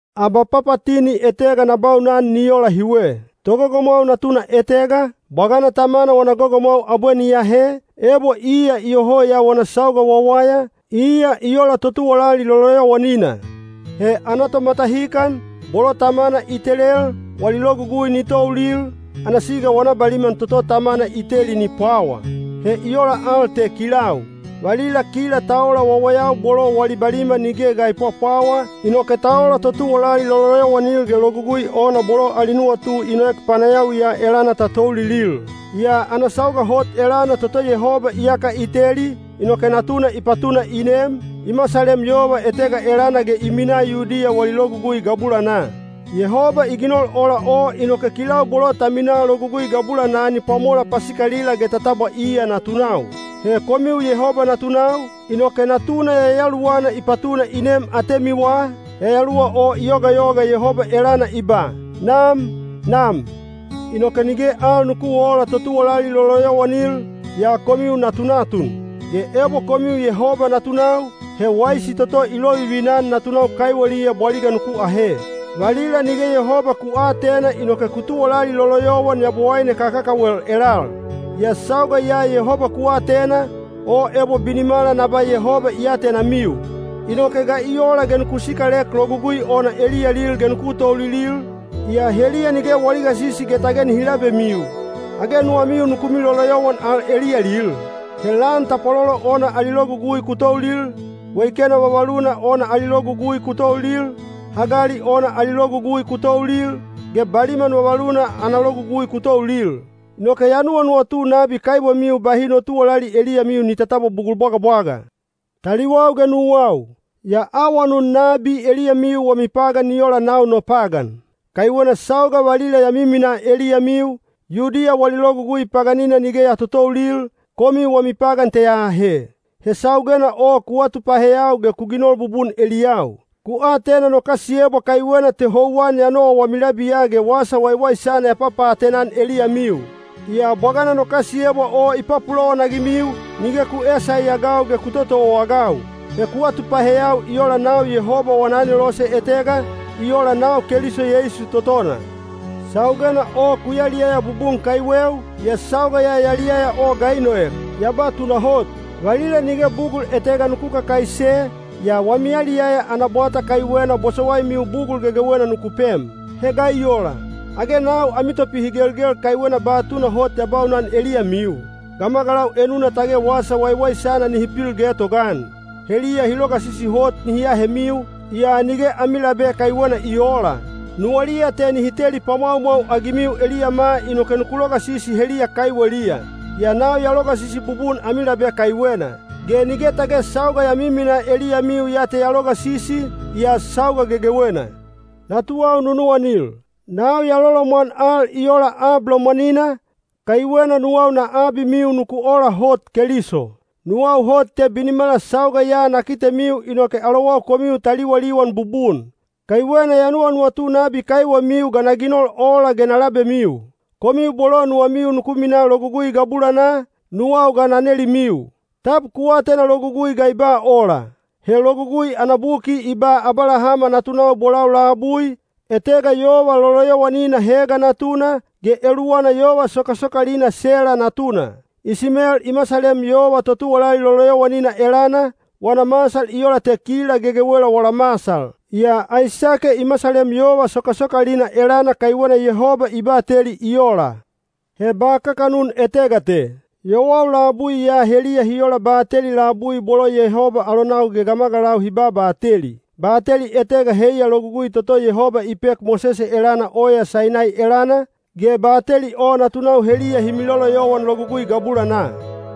Abapapatini etega na baunan ni ola hiwe. Togogomwau natuna etega, bwagana tamana wana gogomwau abwe ni ahe, ebo iya iyoho ya wana sauga wawaya, iya i ola totuwalali loloyowanina. He ana tomatahikan, bolo tamana i telel, wali logugui ni toulil, ana siga wana baliman toto tamana i teli ni pwawa. He i ola te kilau. Valila kila ta ola wawayau bolo wali baliman nige ga i pwapwawa, inoke ta ola totuwalali loloyowanil ge logugui ona bolo ali nuwatu i noek panayawi ya elana ta toulilil. Yaa ana sauga hot elana toto Yehoba iyaka i teli, inoke Natuna i patuna i nem, i masalem yova etega elana ge i minaa Yudiya wali Logugui gabulanaa. Yehoba i ginol ola o inoke kilau bolo ta minaa Logugui gabulanaa ni pwamola pasikalila ge ta tabwa iya natunau. He komiu Yehoba natunau, inoke Natuna Yayaluwana i patuna i nem atemiwa, Yayaluwa o i yogayoga Yehoba elana i ba, “Nam! Nam!” Inoke nige al nuku oola totuwalali loloyowanil, yaa komiu natunatun. Ge ebo komiu Yehoba natunau, he waisi toto i lovivina-an natunau kaiweliya bwaliga nuku ahe. Valila nige Yehoba ku aatena inoke ku tuwalali loloyowan yabowaine kakakawel elal. Yaa sauga ya Yehoba ku atena, o ebo binimala na ba Yehoba i atenamiu. Inoke ga i ola ge nuku sikalek logugui ona eliyalil ge nuku toulilil, yaa heliya nige wali gasisi ge tage nihi labemiu? Age nuwamiu nuku miloloyowan al eliyalil? He lan tapwalolo ona ali logugui ku toulil, weikena vavaluna ana logugui ku toulil, hagali ona ali logugui ku toulil, ge baliman vavaluna ana logugui ku toulil. Inoke ya nuwanuwatu nabi kaiwemiu bahi no tuwalali eliyamiu ni tatabwa bugul bwagabwaga. Taliwau ge nuwau, ya awanun nabi eliyamiu wami pagan ni ola nau no pagan. Kaiwena sauga valila ya miminaa eliyamiu, Yudiya wali logugui paganina nige ya totoulil, komiu wami pagan te ya ahe. He saugena o ku atupaheyau ge ku ginol bubun eliyau. Ku atena no kasiyebwa kaiwena te houwan ya nowa wami labiya ge wasa waiwaisana ya papaatena-an eliyamiu. Yaa bwagana no kasiyebwa o i papulowan-agimiu, nige ku eesaiagau ge ku totowaagau. He ku atupaheyau i ola nau Yehoba wana anelose etega, i ola nau Keliso Yeisu totona. Saugena o ku yaliyaya bubun kaiweu, yaa sauga ya yaliyaya o ga i noek? Ya ba tunahot, valila nige bugul etega nuku kakaise, yaa wami yaliyaya ana bwata kaiwena bosowaimiu bugul gegewena nuku pem. He ga i ola? Age nau ami topihigelgel kaiwena ba tunahot ya baunan eliyamiu? Gamagalau enuna tage wasa waiwaisana nihi pil getogaan. Heliya hi logasisi hot nihi ahemiu, yaa nige ami labe kaiwena i oola. Nuwaliya te nihi teli pwamwaumwau-agimiu eliyama inoke nuku logasisi heliya kaiweliya. Yaa nau ya logasisi bubun ami labe kaiwena. Ge nige tage sauga ya miminaa eliyamiu ya te ya logasisi, yaa sauga gegewena. Natuwau nunuwanil, nau ya lolomwan al i ola ab lomwanina, kaiwena nuwau na abimiu nuku ola hot Keliso. Nuwau hot te binimala sauga ya na kitemiu inoke alowau komiu ta liwaliwan bubun. Kaiwena ya nuwanuwatu nabi kaiwemiu ga na ginol ola ge na labemiu. Komiu bolo nuwamiu nuku minaa Logugui gabulanaa, nuwau ga na nelimiu, “Tab ku atena Logugui ga i ba ola?” He Logugui ana buki i ba Abalahama natunau bolau labui, etega yova loloyowanina Hega natuna, ge eluwana yova sokasokalina Sela natuna. Isimel i masalem yova totuwalali loloyowanina elana, wana masal i ola te kila gegewela wala masal. Yaa Aisake i masalem yova sokasokalina elana kaiwena Yehoba i bateli i ola. He ba kakanun etega te. Yowau labui ya heliya hi ola bateli labui bolo Yehoba alonau ge gamagalau hi babateli. Bateli etega heiya logugui toto Yehoba i pek Mosese elana oya Sainai elana, ge bateli o natunau heliya hi miloloyowan logugui gabulanaa.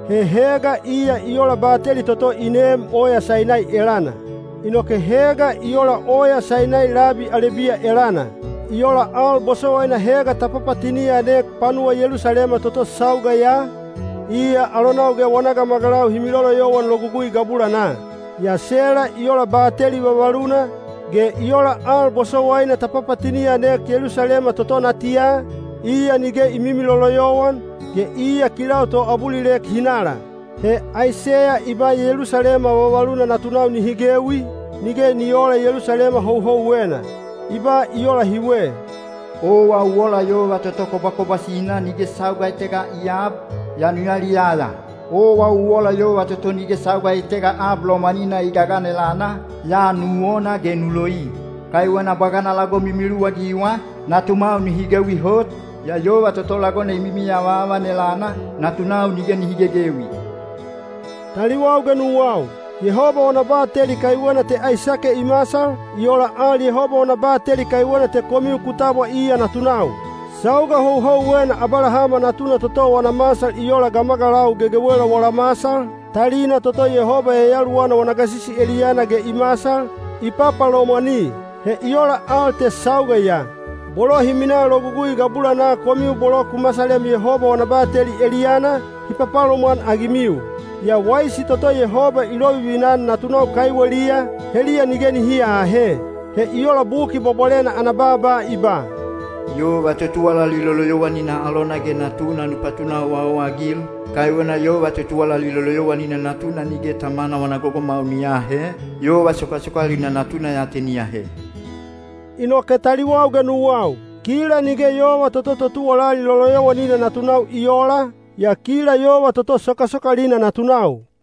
He Hega iya i ola bateli toto i neem oya Sainai elana. Inoke Hega i ola oya Sainai labi Alebiya elana. I ola al bosowaina Hega ta papatini-anek panuwa Yelusalema toto sauga ya, iya alonau ge wana gamagalau hi miloloyowan logugui gabulanaa. Yaa Sela i ola bateli vavaluna, ge i ola al bosowaina ta papatini-anek Yelusalema toto natiya, iya nige i mimiloloyowan, ge iya kilau toabulilek hinala. He Aiseya i ba Yelusalema vavaluna natunau nihi gewi, nige ni oola Yelusalema houhouwena. I ba i ola hiwe: Owa u ola yova toto kobwakobwasina nige sauga etega i aab, yaa nu yaliyaya. Owa u ola yova toto nige sauga etega ab lomwanina i gagan elana, yaa nu wona ge nu loi. Kaiwena bwagana lagom i miluwagiwa, natumwau nihi gewi hot, yaa yova toto lagona i mimiavaavan elana, natunau nige nihi gegewi. Taliwau ge nuwau, Yehoba wana bateli kaiwena te Aisake i masal, i ola al Yehoba wana bateli kaiwena te komiu ku tabwa iya natunau. Sauga houhouwena Abalahama natuna toto wana masal i ola gamagalau gegewela wala masal, talina toto Yehoba Yayaluwana wana gasisi eliyana ge i masal, i papalomwani. He i ola al te sauga ya. Bolo hi minaa Logugui gabulanaa komiu bolo ku masalem Yehoba wana bateli eliyana, hi papalomwan-agimiu. Yaa waisi toto Yehoba i lovivina-an natunau kaiweliya, heliya nige nihi aahe. He i ola Buki Bwabwalena ana baaba i ba, “Yova totuwalali loloyowanina alona ge natuna nu patuna owaowa-agil. Kaiwena yova totuwalali loloyowanina natuna nige tamana wana gogomwau ni aahe, yova sokasokalina natuna ya te ni ahe.” Inoke taliwau ge nuwau, kila nige yova toto totuwalali loloyowanina natunau i oola, yaa kila yova toto sokasokalina natunau.